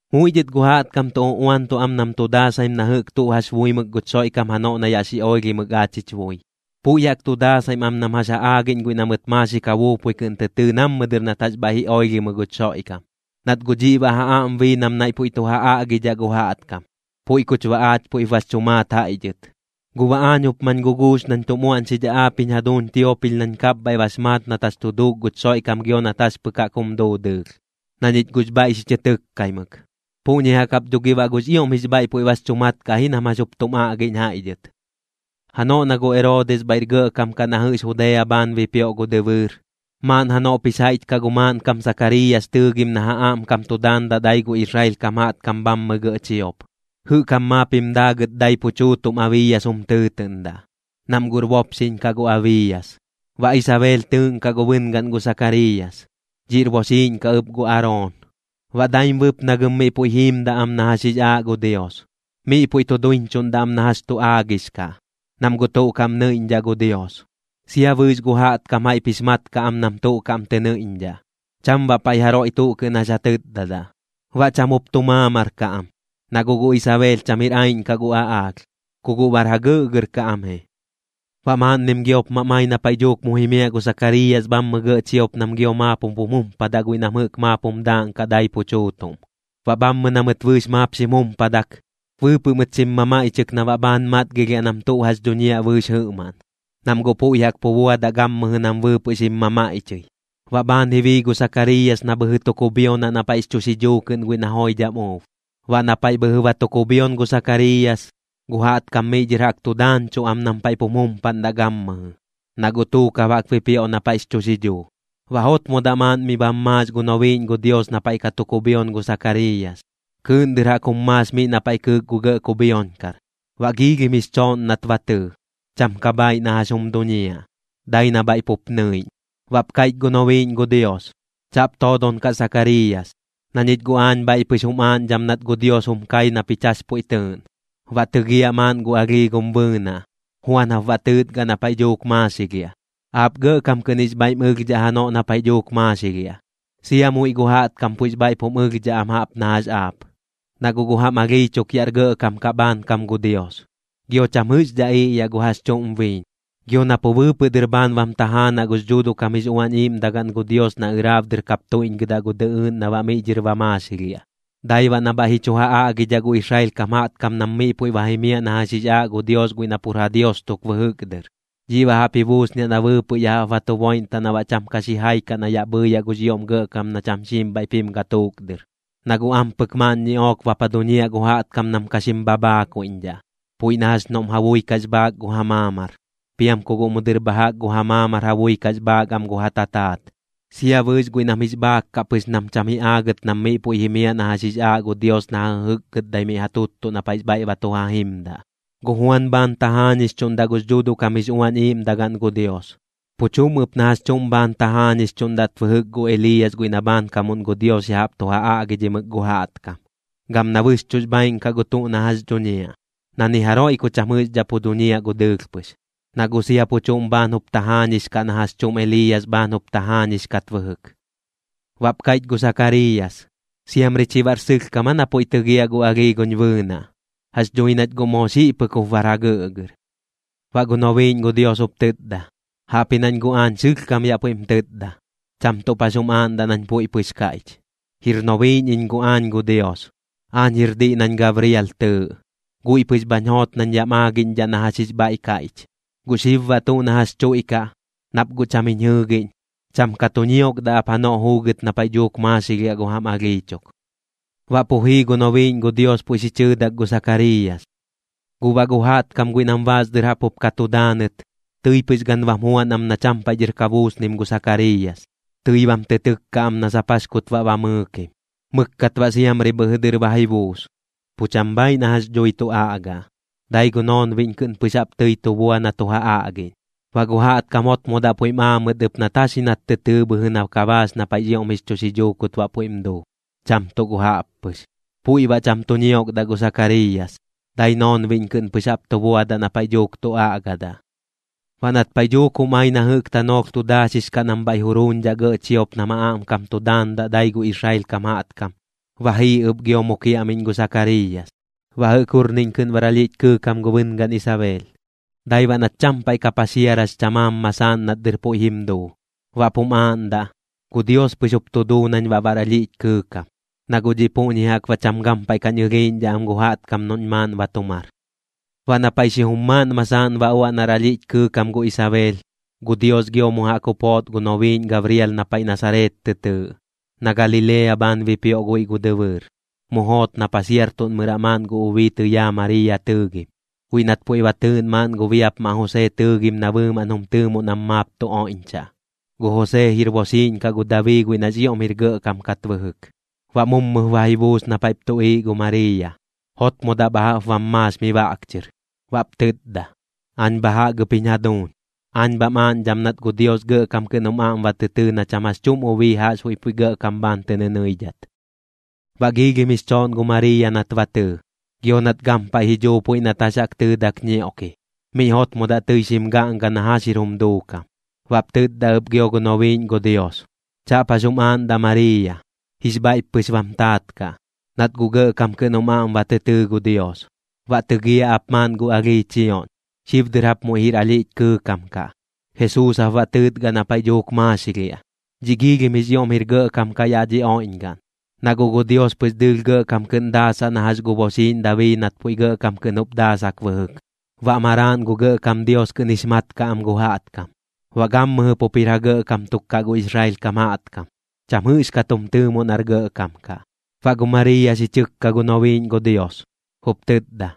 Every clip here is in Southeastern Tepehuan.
Muiꞌ dhɨt gu jaꞌtkam tu uꞌuantuꞌ am nam tu daasaim na jɨꞌk tuꞌ jax buimɨk guch Xoiꞌkam janoꞌ na yaꞌ xi oilhimɨk aach jich bui. Puiꞌ jaꞌk tu daasaim am nam jax ja aagiꞌñ guiꞌ na mɨt maaxik ja buupui kɨꞌn tɨ tɨɨ nammɨ dɨr nat jax bhaiꞌ ji oilhimɨ guch Xoiꞌkam, nat guꞌ dhiꞌ baꞌ ja aꞌm bii nam naiꞌ puiꞌ tu ja aꞌgidhaꞌ gu jaꞌtkam, puiꞌ kuch baꞌ aach puiꞌp bax chu maat jaiꞌ dhɨt. Guꞌ baꞌ aañ jup mañ guguux nañ tum uaꞌñxidhaꞌ aap jiñ jaduuñ Tiopil nañ kapbhaiꞌ bax maat nat jax tu duuk guch Xoiꞌkam gio nat jax pɨk jaꞌk jum duu dɨɨlh, na ñich guꞌx bhaiꞌ xi chɨ tɨkkaimɨk. Puꞌñi jaꞌk jap dho gi baꞌ guꞌx ioꞌm jix bhaiꞌ puiꞌ bax chu mat kaꞌ ji nam jax jup tum aꞌgiꞌñ jaiꞌ dhɨt. Janoꞌ na gu Eroodis bhaiꞌr gɇꞌkam kaꞌ na jɨꞌx Judea bhaan bipioꞌ gu dɨbɨɨr, maaꞌn janoꞌp jix jaiꞌch kaꞌ gu maaꞌnkam Sakariiyas tɨɨgim na ja aꞌmkam tu daandaꞌ dai gu Israel kam jaꞌtkam bhammɨ gɇꞌ chiop. Jɨꞌk jam maap jim daagɨt dai pu chuutuꞌm Abiiyas jum tɨɨtɨꞌndaꞌ, nam guꞌr bopxiꞌñ kaꞌ gu Abiiyas. Baꞌ Isabeel tɨɨꞌnkaꞌ gu bɨngaꞌn gu Sakariiyas, dhiꞌr boxiiꞌñ kaꞌ ɨp gu Aroon. Baꞌ daim bɨpnagɨm miꞌ puiꞌ jiimdaꞌ am na jax jix aaꞌ gu Dios, miꞌ puiꞌ tu duiñchuꞌndaꞌ am na jax tu aagix kaꞌ, nam guꞌ tuꞌ kaꞌm nɨiꞌñdhaꞌ gu Dios. Sia bɨɨx gu jaꞌtkam jaiꞌp jix mat kaꞌ am nam tuꞌ kaꞌm tɨ nɨiꞌñdhaꞌ, cham baꞌ paiꞌ jaroiꞌ tuꞌ kɨꞌn jax ja tɨtdadaꞌ. Baꞌ cham jup tu maamar kaꞌ am, na guꞌ gu Isabeel cham jir aiꞌñ kaꞌ gu aꞌaalh, ku guꞌ bar jagɨꞌgɨr kaꞌ am ji. Baꞌ maaꞌnnim giop mam ai na paiꞌ dhuuk mu jimiaꞌ gu Sakariiyas bhammɨ gɇꞌ chiop nam gio maap jup jum jumpadaꞌ guiꞌ nam jɨꞌk maap jum daaꞌnkaꞌ dai pu chuutuꞌm. Baꞌ bhammɨ na mɨt bɨɨx maap xim jumpadak, bɨɨpɨꞌ mɨt xim mamaiꞌchɨk na baꞌ bhaan matgilhiaꞌ nam tuꞌ jax dhuñiaꞌ bɨɨx jɨꞌmaꞌn, nam guꞌ puiꞌ jaꞌk pu buadaꞌ gammɨjɨ nam bɨɨpɨꞌ xim mamaiꞌchɨi. Baꞌ bhaan ji bii gu Sakariiyas na bhɨjɨ tu kubhionaꞌ na paiꞌx chu xidhuu kɨꞌn guiꞌ na joidham uub. Baꞌ na paiꞌ bhɨjɨ ba tu kubhion gu Sakariiyas, gu jaꞌtkam miꞌ dhɨr jaꞌk tu daañchuꞌ am nam paiꞌ pum jumpaꞌndaꞌ gammɨjɨ, na guꞌ tuukab jaꞌk bipioꞌ na paiꞌx chu xidhuu. Baꞌ jotmodaꞌ maaꞌn miꞌ bam maax gu nobiiꞌñ gu Dios na paiꞌ ka tu kubhion gu Sakariiyas, kɨɨꞌn dɨr jaꞌk jum maax miꞌ na paiꞌ kɨɨk gu gɇꞌ kubhioñkar. Baꞌ giilhim jix chooꞌn nat ba tɨɨ, cham ka bhaaiꞌ na jax jum duñiaꞌ, dai na bhaiꞌ pup nɨiꞌñ. Baꞌp kaiꞌch gu nobiiꞌñ gu Dios: ―Chaꞌp toodon kaꞌ Sakariiyas, na ñich guꞌ aañ bhaiꞌ pɨx jum aaꞌñdham nat gu Dios jum kai na pich jax puiꞌ tɨɨꞌn. Baꞌ tɨgiaꞌ maaꞌn gu alhii gum bɨɨnaꞌ, Juan jap baꞌ tɨɨtgaꞌ na paiꞌ dhuuk maaxilhiaꞌ. Aap gɇꞌkam kɨꞌn jix bhaiꞌm ɨlhdhaꞌ janoꞌ na paiꞌ dhuuk maaxilhiaꞌ, sia muiꞌ gu jaꞌtkam puiꞌx bhaiꞌp jum ɨlhdhaꞌ am jaꞌp na jax aap, na guꞌ gu jam alhii chuk yaꞌr gɇꞌkam kaꞌ bhaankam gu Dios. Gio cham jɨꞌxdhaꞌ iꞌyaꞌ gu jax chuꞌm biiñ, gio na pu bɨɨpɨꞌ dɨr bhaan bam tajaanaꞌ gux Dhuuduꞌ kam jix Uañ Iiꞌmdagaꞌn gu Dios na ɨraab dɨr kap tuiꞌñgɨdaꞌ gu dɨꞌɨɨꞌn na baꞌ miꞌ dhɨr ba maaxilhiaꞌ. Dai baꞌ na bhaiꞌ ji chu ja aꞌgidhaꞌ gu Israel kam jaꞌtkam nam miꞌ puiꞌ ba jimiaꞌ na jax jix aaꞌ gu Dios guiꞌ na pur ja Dios tuk bɨjɨk dɨr. Dhiꞌ baꞌ jaꞌp ji buusniaꞌ na bɨɨpɨꞌ ya jaꞌp ba tu boiꞌntaꞌ na baꞌ cham ka xijai kaꞌ na yaꞌ bhɨɨyaꞌ gux ioꞌm Gɇꞌkam na cham xiim bhaiꞌp jim gatuuk dɨr. Na guꞌ ampɨk maaꞌn ñiꞌook bap ja duñiaꞌ gu jaꞌtkam nam ka xim bhabhaakuiꞌñdhaꞌ, puiꞌ na jax noꞌm ja bui kax bhaak gu ja maamar, piam ku guꞌ mu dɨr bha jaꞌk gu ja maamar ja bui kax bhaak am gu ja tataat. Sia bɨɨx guiꞌ nam jix bhaak kaꞌ pɨx nam cham ji aagɨt nam miꞌ puiꞌ jimiaꞌ na jax jix aaꞌ gu Dios na ja jɨjɨkgɨtdai miꞌ ja tuttuꞌ na paiꞌx bhaiꞌ ba tu ja jimdaꞌ. Gu Juan bhaan tajaañixchuꞌndaꞌ gux Dhuuduꞌ kam jix Uañ Iiꞌmdagaꞌn gu Dios, pu chuꞌm ɨp na jax chuꞌm bhaan tajaañixchuꞌndat bɨjɨk gu Eliiyas guiꞌ na bhaankamuꞌn gu Dios ya jaꞌp tu ja aꞌgidhimɨk gu jaꞌtkam. Gam na bɨxchuꞌx bhaaiꞌn kaꞌ gu tuꞌ na jax dhuñiaꞌ, na ni jaroiꞌ ku cham jɨꞌxdhaꞌ pu duñiaꞌ gu dɨɨlh pɨx, na guꞌ sia pu chuꞌm bhaan jup tajaañix kaꞌ na jax chuꞌm Eliiyas bhaan jup tajaañix kat bɨjɨk. Baꞌp kaiꞌch gu Sakariiyas: ―¿Siamri chi baꞌr sɨlhkam aa na puiꞌ tɨgiaꞌ gu alhii guñ bɨɨnaꞌ? Jax dhui nach guꞌ moo xiꞌ pɨk jup bar jagɨꞌgɨr. Baꞌ gu nobiiꞌñ gu Dios jup tɨtda: ―Jaꞌpji nañ guꞌ aañ sɨlhkam yaꞌ puiꞌm tɨtda, cham tuꞌp jax jum aaꞌndaꞌ nañ puiꞌ pɨx kaiꞌch. Jir nobiiꞌñ iñ guꞌ aañ gu Dios. Aañ jir diꞌ nañ Gabrial tɨɨꞌ. Guiꞌ pɨx bhañ joot nañ yaꞌm aagiꞌñdhaꞌ na jax jix bhaiꞌ kaiꞌch. Guꞌ xib baꞌ tuꞌ na jax chuiꞌkaꞌ, nap guꞌ cham jiñ jɨɨgiꞌñ, cham ka tu ñiokdaꞌ ap janoꞌ juugɨt na paiꞌ dhuuk maaxilhiaꞌ gu jam alhii chuk. Baꞌ pu jii gu nobiiꞌñ gu Dios puiꞌ xi chɨɨdak gu Sakariiyas. Guꞌ baꞌ gu jaꞌtkam guiꞌ nam baas dɨr jaꞌp jup ka tu daanɨt, tɨi pɨx gan bam juan am na cham paiꞌ dhɨr ka buusnim gu Sakariiyas. Tɨi bam tɨ tɨkka am na sap jax kut baꞌ ba mɨɨkim. Mɨkkat baꞌ siamri bhɨjɨ dɨr ba ji buus. Pu cham bhaaiꞌ na jax dhui tu aꞌgaꞌ, dai gu noonbiꞌñ kɨꞌn pɨx jaꞌp tɨi tu bua na tu ja aꞌgiꞌñ. Baꞌ gu jaꞌtkam jotmodaꞌ puiꞌm aa mɨt ɨp nat jax ji nat tɨ tɨɨ bhɨjɨ na ka baax na paiꞌx ioꞌm jix chu xidhuu kut baꞌ puiꞌm duu, cham tuꞌ gu jaꞌp pɨx. Puiꞌ baꞌ cham tu ñiokdaꞌ gu Sakariiyas, dai noonbiꞌñ kɨꞌn pɨx jaꞌp tu buadaꞌ na paiꞌ dhuuk tu aꞌgadaꞌ. Baꞌ nat paiꞌ dhuuk jum ai na jɨꞌk tanoolh tu daaxix kaꞌ nam bhaiꞌ juruuñdhaꞌ gɇꞌ chiop nam ja aꞌmkam tu daandaꞌ dai gu Israel kam jaꞌtkam, ba jii ɨp gio mu kiaꞌmiꞌñ gu Sakariiyas. Baꞌ jɨꞌk jurniꞌñ kɨꞌn bar alhiꞌch kɨɨkam gu bɨngaꞌn Isabeel, dai baꞌ nat cham paiꞌ ka paxiarax chamaam masaaꞌn nat dɨr puiꞌ jim duu. Baꞌp jum aaꞌndaꞌ: “Gu Dios pɨx jup tu duu nañ baꞌ bar alhiꞌch kɨɨkam, na guꞌ dhiꞌ puꞌñi jaꞌk baꞌ cham gampaiꞌ kañ ɨlhiiꞌñdhaꞌ am gu jaꞌtkam noꞌñ maaꞌn ba tu mar.” Baꞌ na paiꞌ xijum maaꞌn masaaꞌn ba uaꞌ nar alhiꞌch kɨɨkam gu Isabeel, gu Dios gio mu jaꞌk jup joot gu nobiiꞌñ Gabrial na paiꞌ Nasareet tɨ tɨɨꞌ, na Galilea bhaan bipioꞌ guiꞌ gu dɨbɨɨr. Mu joot na paxiartuꞌnmɨraꞌ maaꞌn gu ubii tɨyaa Mariiya tɨɨgim, guiꞌ nat puiꞌ ba tɨɨꞌn maaꞌn gu biapmaꞌ Josee tɨɨgim na bɨɨmaꞌn jum tɨɨmoꞌ nam maap tu oiꞌñchaꞌ. Gu Josee jir boxiiꞌñ kaꞌ gu Dabii guiꞌ nax ioꞌm jir gɇꞌkam kat bɨjɨk. Baꞌ mummɨ ba ji buus na paiꞌp tuꞌiiꞌ gu Mariiya, jotmodaꞌ bha jaꞌp bam maax mi baꞌk chɨr. Baꞌp tɨtda: ―Aañ bha jaꞌk ɨp jiñ jaduuñ. Aañ bham aaꞌñdham nat gu Dios gɇꞌkam kɨꞌn jum aꞌm ba tɨ tɨɨ na cham jax chuꞌm ubii jaꞌxbuiꞌ puiꞌ gɇꞌkam bhaan tɨ nɨnɨidhat. Baꞌ giilhim jix chooꞌn gu Mariiya nat ba tɨɨ, gio nat gampaiꞌ ji dhuu puiꞌ nat jax jaꞌk tɨɨdak ñioꞌki. Miꞌ jotmodaꞌ tɨi xim gaꞌnga na jax jir jum duukam. Baꞌp tɨtda ɨp gio gu nobiiꞌñ gu Dios: ―Chaꞌp jax jum aaꞌndaꞌ Mariiya. Jix bhaiꞌp pɨx bam taat kaꞌ, nat guꞌ gɇꞌkam kɨꞌn jum aꞌm ba tɨ tɨɨ gu Dios. Baꞌ tɨgiaꞌ ap maaꞌn gu alhii chioꞌñ, xib dɨr jap muiꞌ jir alhiꞌch kɨɨkam kaꞌ. Jesuus jap baꞌ tɨɨtgaꞌ na paiꞌ dhuuk maaxilhiaꞌ. Dhiꞌ jix ioꞌm jir gɇꞌkam kaꞌ yaꞌ dhi oiꞌñgaꞌn, na guꞌ gu Dios pɨx dɨɨlh gɇꞌkam kɨꞌn daasaꞌ na jax gu boxiiꞌñ Dabii nat puiꞌ gɇꞌkam kɨꞌn jup daasak bɨjɨk. Baꞌ maraaꞌn gu Gɇꞌkam Dios kɨꞌn jix mat kaꞌ am gu jaꞌtkam. Baꞌ gammɨjɨ pup jir ja gɇꞌkam tuk kaꞌ gu Israel kam jaꞌtkam, cham jɨꞌxkat jum tɨɨmoꞌ nar gɇꞌkam kaꞌ. Baꞌ gu Mariiya xi chɨkka gu nobiiꞌñ gu Dios, jup tɨtda: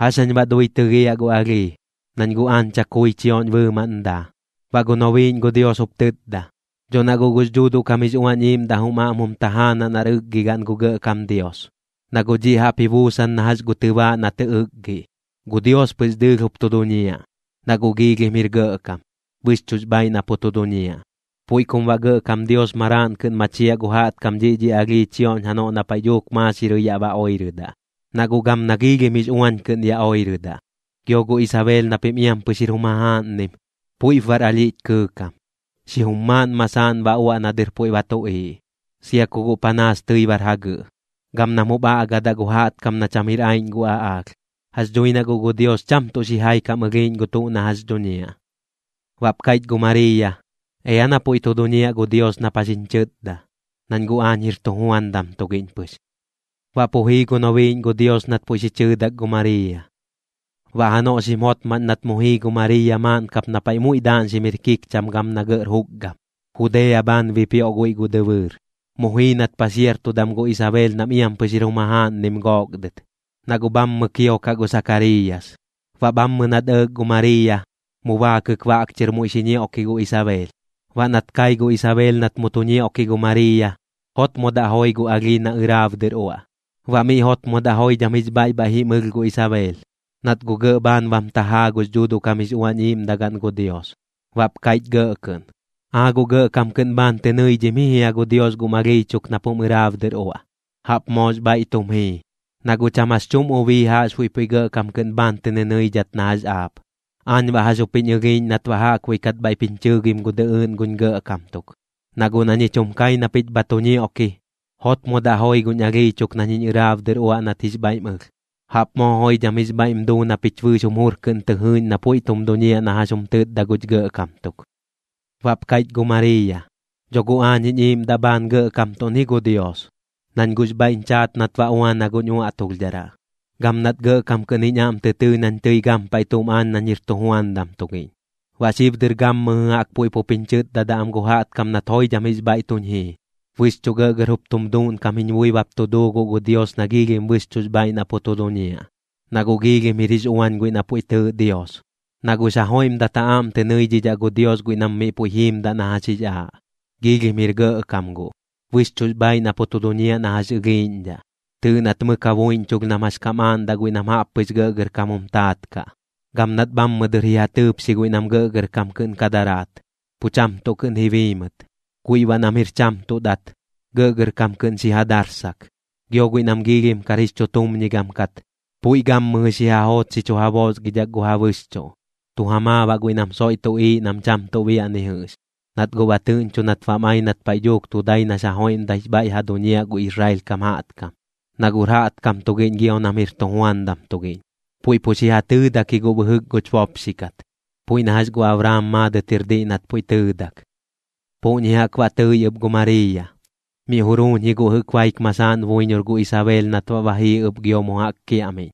―¿Jax jañ baꞌ dui tɨgiaꞌ gu alhii, nañ guꞌ aañ chakui chioꞌñ bɨɨmaꞌn daa? Baꞌ gu nobiiꞌñ gu Dios jup tɨtda: ―Dho na guꞌ gux Dhuuduꞌ kam jix Uañ Iiꞌmdaꞌ jum aꞌm jum tajaanaꞌ nar ɨkgigaꞌn gu Gɇꞌkam Dios, na guꞌ dhiꞌ jaꞌp ji buusan na jax gu tɨbaaꞌ na tɨ ɨkgiꞌ. Gu Dios pɨx dɨɨlh jup tu duñiaꞌ, na guꞌx ioꞌm jir gɇꞌkam, bɨxchuꞌx bhaaiꞌ na pu tu duñiaꞌ. Puiꞌ kum baꞌ Gɇꞌkam Dios maraaꞌn kɨꞌn machiaꞌ gu jaꞌtkam dhiꞌ dhi alhii chioꞌñ janoꞌ na paiꞌ dhuuk maaxirɨi yaꞌ ba oirɨdaꞌ, na guꞌ gam nax uañ kɨꞌn ya oirɨdaꞌ. Gio gu Isabeel na pim iam pɨx jir jum jajaaꞌnnim, puiꞌp bar alhiꞌch kɨɨkam, xijum maaꞌn masaaꞌn ba uaꞌ na dɨr puiꞌ ba tuꞌiiꞌ, sia ku guꞌ panaas tɨi bar jagɨꞌ, gam nam jup aꞌgadaꞌ gu jaꞌtkam na cham jir aiꞌñ gu aꞌaalh. Jax dhui na guꞌ gu Dios cham tuꞌ xijai kam ɨlhiiꞌñ gu tuꞌ na jax dhuñiaꞌ. Baꞌp kaiꞌch gu Mariiya: ―Ea na puiꞌ tu duñiaꞌ gu Dios nap jax jiñ chɨtda, nañ guꞌ aañ jir tujuandam tugiꞌñ pɨx. Baꞌ pu jii gu nobiiꞌñ gu Dios nat puiꞌ xi chɨɨdak gu Mariiya. Baꞌ janoꞌ xim jotmaꞌñ nat mu jii gu Mariiya maaꞌn kap na paiꞌ muiꞌ daaꞌñxim jir kikcham gam na gɇꞌr jukgam, Judea bhaan bipioꞌ guiꞌ gu dɨbɨɨr. Mu jii nat paxiartudam gu Isabeel nam iam pɨx jir jum jajaaꞌnnim gook dɨt, na guꞌ bhammɨ kiokaꞌ gu Sakariiyas. Baꞌ bhammɨ nat ɇɇk gu Mariiya, mu baakɨk baꞌk chɨr muiꞌ xi ñioꞌki gu Isabeel. Baꞌ nat kai gu Isabeel nat mu tu ñioꞌki gu Mariiya, jotmodaꞌ joi gu alhii na ɨraab dɨr uaꞌ. Baꞌ miꞌ jotmodaꞌ joidham jix bhaiꞌ bhaiꞌ jim ɨlh gu Isabeel, nat guꞌ gɇꞌ bhaan bam tajaa gux Dhuuduꞌ kam jix Uañ Iiꞌmdagaꞌn gu Dios. Baꞌp kaiꞌch gɇꞌ kɨꞌn: ―¡Aa guꞌ gɇꞌkam kɨꞌn bhaan tɨ nɨidhim ji jia gu Dios gum alhii chuk nap jum ɨraab dɨr uaꞌ! Jaꞌp moox bhaiꞌ tum jii, na guꞌ cham jax chuꞌm ubii jaꞌxbuiꞌ puiꞌ gɇꞌkam kɨꞌn bhaan tɨ nɨnɨidhat na jax aap. ¿Aañ baꞌ jax jup jiñ ɨlhiiꞌñ nat baꞌ jaꞌkbuiꞌ kat bhaiꞌp jiñ chɨɨgim gu dɨꞌɨɨꞌn guñ Gɇꞌkam tuk? Na guꞌ na ñich jum kai na pich bha tu ñioꞌki, jotmodaꞌ joi guñ alhii chuk nañ jiñ ɨraab dɨr uaꞌ nat jix bhaiꞌm ɨlh. ¡Jaꞌp moo joidham jix bhaiꞌm duu na pich bɨɨx jum jur kɨꞌn tɨ jɨɨꞌñ na puiꞌ tum duñiaꞌ na jax jum tɨtda guch Gɇꞌkam tuk! Baꞌp kaiꞌch ɨp gu Mariiya: Dho guꞌ aañ jiñ iiꞌmdaꞌ bhaan gɇꞌkamtuꞌn ji gu Dios, nañ guꞌx bhaiꞌñ chaat nat ba uana guñ uaꞌtulhdharaꞌ, gam nat gɇꞌkam kɨꞌn jiñ aꞌm tɨ tɨɨ nañ tɨi gampaiꞌ tuꞌm aañ nañ jir tujuandam tugiꞌñ. Baꞌ xib dɨr gammɨjɨ jaꞌk puiꞌ pup jiñ chɨtdadaꞌ am gu jaꞌtkam nat joidham jix bhaiꞌ tuñ jii. Bɨxchuꞌ gɇꞌgɇr jup tum duuꞌnkam jiñ bui bap tu duu guꞌ gu Dios na bɨxchuꞌx bhaaiꞌ na pu tu duñiaꞌ, na guꞌ giilhim jir jix uañ guiꞌ na puiꞌ tɨɨꞌ Dios. Na guꞌx ja joiꞌmdat ja aꞌm tɨ nɨidhidhaꞌ gu Dios guiꞌ nam miꞌ puiꞌ jiimdaꞌ na jax jix aaꞌ. Jix ioꞌm jir gɇꞌkam guꞌ, bɨxchuꞌx bhaaiꞌ na pu tu duñiaꞌ na jax ɨlhiiꞌñdhaꞌ. Tɨɨꞌ nat mɨk ja buiꞌñchulh nam jax kam aaꞌndaꞌ guiꞌ nam jaꞌp pɨx gɇꞌgɇrkam jum taat kaꞌ. Gam nat bhammɨ dɨr ji ja tɨɨpxi guiꞌ nam gɇꞌgɇrkam kɨꞌn ka daraat, pu cham tuꞌ kɨꞌn ji bii mɨt. Guiꞌ baꞌ nam jir cham tuꞌ dat, gɇꞌgɇrkam kɨꞌn xi ja darsak. Gio guiꞌ nam giilhim kar jix chutumñigam kat, puiꞌ gammɨjɨ xi ja joot xi chu ja boosgidhak gu ja bɨxchuꞌ, tu ja maa baꞌ guiꞌ nam soiꞌ tuꞌiiꞌ nam cham tuꞌ biaꞌ ni jɨꞌx. Nat guꞌ ba tɨꞌñcho nat bam ai nat paiꞌ dhuuk tu dai nax ja joiꞌmdaix bhaiꞌ ja duñiaꞌ gu Israel kam jaꞌtkam, na guꞌr jaꞌtkam tugiꞌñ gio nam jir tujuandam tugiꞌñ. Puiꞌ pu xi ja tɨɨdak ji guꞌ bɨjɨk guch bopxi kat, puiꞌ na jax gu Abraam maadɨt jir diꞌ nat puiꞌ tɨɨdak. Puꞌñi jaꞌk baꞌ tɨi ɨp gu Mariiya. Miꞌ juruuñ ji guꞌ jɨꞌk baik masaaꞌn buiñor gu Isabeel nat baꞌ ba jii ɨp gio mu jaꞌk kiaꞌmiꞌñ.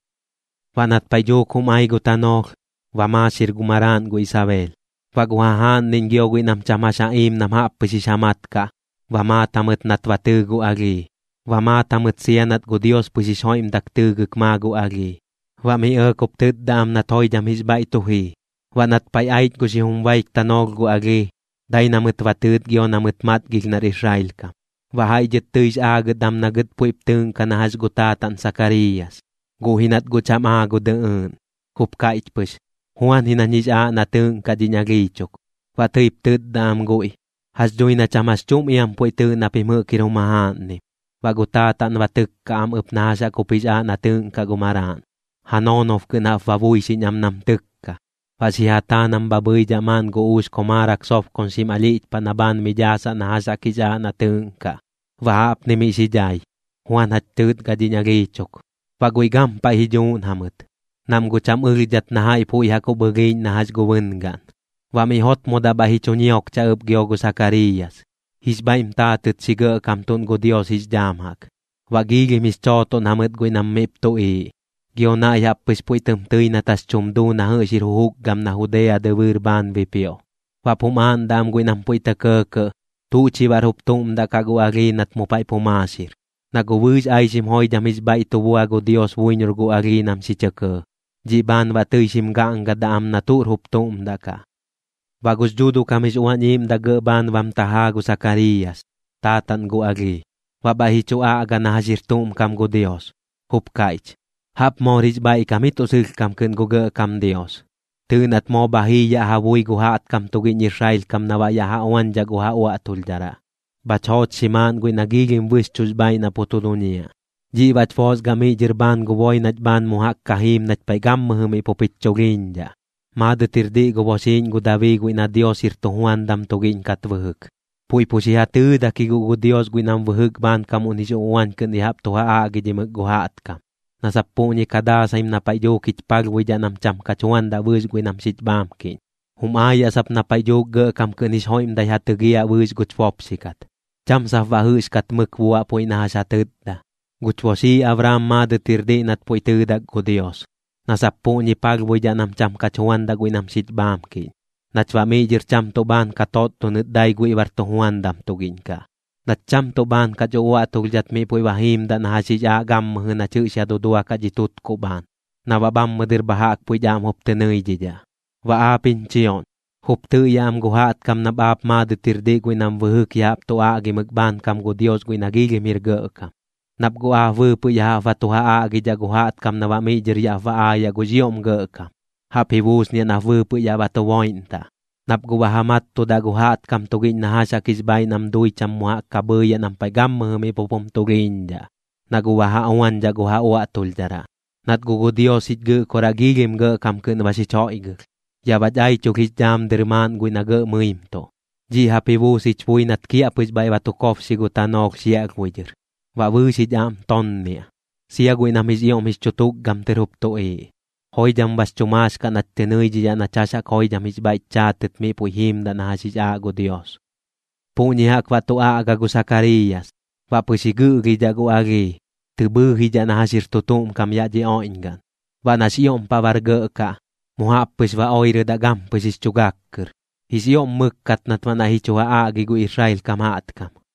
Baꞌ nat paiꞌ dhuuk jum ai gu tanoolh, ba maaxir gu maraaꞌn gu Isabeel. Baꞌ gu jajaaꞌnniꞌñ gio guiꞌ nam cham jax iim nam jaꞌp pɨx jix ja mat kaꞌ, ba maat jamɨt nat ba tɨɨ gu alhii, ba maat jamɨt sia nat gu Dios pɨx jix joiꞌmdak tɨɨgɨk maa gu alhii. Baꞌ mi ɇɇk jup tɨtda am nat joidham jix bhaiꞌ tu jii. Baꞌ nat paiꞌ aich gu xijum baik tanoolh gu alhii, dai na mɨt ba tɨɨt gio na mɨt matgilh nar Israel kam. Baꞌ jaiꞌ dhɨt tɨix aagɨt am na gɨt puiꞌp tɨɨꞌnkaꞌ na jax gu taataꞌn Sakariiyas. Guꞌ ji nat guꞌ cham aa gu dɨꞌɨɨꞌn, jup kaiꞌch pɨx: ―Juan ji nañ jix aaꞌ na tɨɨꞌnkaꞌ dhiñ alhii chuk. Baꞌ tɨip tɨtda am guiꞌ: ―Jax dhui na cham jax chuꞌm iam puiꞌ tɨɨꞌ na pim jɨꞌk jir jum jajaaꞌnnim. Baꞌ gu taataꞌn ba tɨkka am ɨp na jax jaꞌk jup jix aaꞌ na tɨɨꞌnkaꞌ gu maraaꞌn, ja noonob kɨꞌn jaꞌp ba buixiꞌñ am nam tɨkka. Baꞌ xi ja taa nam bha bhɨidhaꞌ maaꞌn gu uux komaarak sobkoñxim alhiꞌch paꞌ na bhaan mi dhaasaꞌ na jax jaꞌk jix aaꞌ na tɨɨꞌnkaꞌ. Baꞌ jaꞌpni miꞌ xi dhai: “Juan jach tɨɨtgaꞌ dhiñ alhii chuk.” Baꞌ guiꞌ gampaiꞌ ji dhuuꞌn jamɨt, nam guꞌ cham ɨlhdhat na jaiꞌ puiꞌ jaꞌk jup ɨlhiiꞌñ na jax gu bɨngaꞌn. Baꞌ miꞌ jotmodaꞌ bhaiꞌ ji chu ñiokcha ɨp gio gu Sakariiyas, jix bhaiꞌm taatɨt xi gɇꞌkamtuꞌn gu Dios jix dhaam jaꞌk. Baꞌ giilhim jix chootoꞌn jamɨt guiꞌ nam miꞌp tuꞌiiꞌ, gio naiꞌ jaꞌp pɨx puiꞌ tɨm tɨi nat jax tum duu na jɨꞌx jir jujukgam na Judea dɨbɨɨr bhaan bipioꞌ. Baꞌp jum aaꞌndaꞌ am guiꞌ nam puiꞌ tɇ kɇɇkɇꞌ: ―¿Tuꞌ chi baꞌr jup tuꞌm daꞌ kaꞌ gu alhii nat mu paiꞌ pu maaxir? Na guꞌ bɨɨx aixim joidham jix bhaiꞌ tu buadaꞌ gu Dios buiñor gu alhii nam xi chɇ kɇɇ, dhiꞌ bhaan baꞌ tɨi xim gaꞌngadaꞌ am na tuꞌr jup tuꞌm daꞌ kaꞌ. Baꞌ gux Dhuuduꞌ kam jix Uañ Iiꞌmdaꞌ gɇꞌ bhaan bam tajaa gu Sakariiyas, taataꞌn gu alhii, baꞌ bhaiꞌ ji chu aꞌga na jax jir tuꞌm kam gu Dios, jup kaiꞌch: ¡Jaꞌp moor jix bhaiꞌkam ji tuꞌ sɨlhkam kɨꞌn gu Gɇꞌkam Dios! Tɨɨꞌ nat moo bha jii yaꞌ ja bui gu jaꞌtkam tugiꞌñ Israel kam na baꞌ yaꞌ ja uañdhaꞌ gu ja uaꞌtulhdharaꞌ. Bhach joochxi maaꞌn guiꞌ na bɨxchuꞌx bhaaiꞌ na pu tu duñiaꞌ. Dhiꞌ baꞌch boosgaꞌ miꞌ dhɨr bhaan gu boi nach bhaan mu jaꞌk ka jiim nach paiꞌ gammɨjɨ miꞌ pup jich chulhiiñdhaꞌ. Maadɨt jir diꞌ gu boxiiꞌñ gu Dabii guiꞌ na Dios jir tujuandam tugiꞌñ kat bɨjɨk. Puiꞌ pu xi ja tɨɨdak ji guꞌ gu Dios guiꞌ nam bɨjɨk bhaankamuꞌn jix uꞌuañ kɨꞌn ya jaꞌp tu ja aꞌgidhimɨk gu jaꞌtkam, na sap puꞌñi ka daasaim na paiꞌ dhuuk jich palhbuidhaꞌ nam cham kach juandaꞌ bɨɨx guiꞌ nam xich bhaamkiꞌñ. Jum aayaꞌ sap na paiꞌ dhuuk gɇꞌkam kɨꞌn jix joiꞌmdai ja tɨgiaꞌ bɨɨx guch bopxi kat, cham sap baꞌ jɨꞌxkat mɨk buaꞌ puiꞌ na jax ja tɨtda. Guch boxii Abraam maadɨt jir diꞌ nat puiꞌ tɨɨdak gu Dios, na sap puꞌñich palhbuidhaꞌ nam cham kach juandaꞌ guiꞌ nam xich bhaamkiꞌñ nach baꞌ miꞌ dhɨr cham tuꞌ bhaan ka totdonɨt dai guiꞌ bar tujuandam tugiꞌñ kaꞌ, nach cham tuꞌ bhaan kach uaꞌtulhdhat miꞌ puiꞌ ba jiimdaꞌ na jax jix aaꞌ gammɨjɨ nach jɨꞌx ya duduakaꞌ dhi tutkuꞌ bhaan, na baꞌ bhammɨ dɨr bha jaꞌk puiꞌch aꞌm jup tɨ nɨidhidhaꞌ. Baꞌ aap jiñ chioꞌñ, jup tɨꞌyaꞌ am gu jaꞌtkam nap aap maadɨt jir diꞌ guiꞌ nam bɨjɨk ya jaꞌp tu aꞌgimɨk bhaankam gu Dios guiꞌ nax ioꞌm jir gɇꞌkam, nap guꞌ aap bɨɨpɨꞌ ya jaꞌp ba tu ja aꞌgidhaꞌ gu jaꞌtkam na baꞌ miꞌ dhɨr yaꞌp ba aayaꞌ gux ioꞌm gɇꞌkam, jaꞌp ji buusniaꞌ nap bɨɨpɨꞌ yaꞌ ba tu boiꞌntaꞌ. Nap guꞌ ba ja mattudaꞌ gu jaꞌtkam tugiꞌñ na jax jaꞌk jix bhaaiꞌ nam dui cham mu jaꞌk ka bhɨɨyaꞌ nam paiꞌ gammɨjɨ miꞌ pup jum tulhiiñdhaꞌ, na guꞌ ba ja uañdhaꞌ gu ja uaꞌtulhdharaꞌ. Nat guꞌ gu Dios jich Gɨꞌkoraꞌ gɇꞌkam kɨꞌn ba xich joiꞌgɨlh, yaꞌ bach aichulh jix dhaam dɨr maaꞌn guiꞌ na gɇꞌ mɨimtuꞌ. Dhiꞌ jaꞌp ji buus jich bui nat kiaꞌpɨx bhaiꞌ ba tu kobxi gu tanoolh xiaꞌlhbui dhɨr. Baꞌ bɨɨx jich aꞌm tonniaꞌ, sia guiꞌ nam jix ioꞌm jix chu tukgam tɨr jup tuꞌiiꞌ. Joidham bax chu maax kaꞌ nach tɨ nɨidhidhaꞌ nach jax jaꞌk joidham jix bhaiꞌch chaatɨt miꞌ puiꞌ jiimdaꞌ na jax jix aaꞌ gu Dios. Puꞌñi jaꞌk baꞌ tu aꞌga gu Sakariiyas. Baꞌ pɨx ji gɨꞌlhidhaꞌ gu alhii, tɨ bhɨɨjidhaꞌ na jax jir tu tuꞌm kam yaꞌ dhi oiꞌñgaꞌn. Baꞌ nax ioꞌm paꞌ bar gɇꞌ kaꞌ, mu jaꞌp pɨx ba oirɨdaꞌ gampɨx jix chu gak kɨr. Jix ioꞌm mɨkkat nat baꞌ naiꞌ ji chu ja aꞌgi gu Israel kam jaꞌtkam.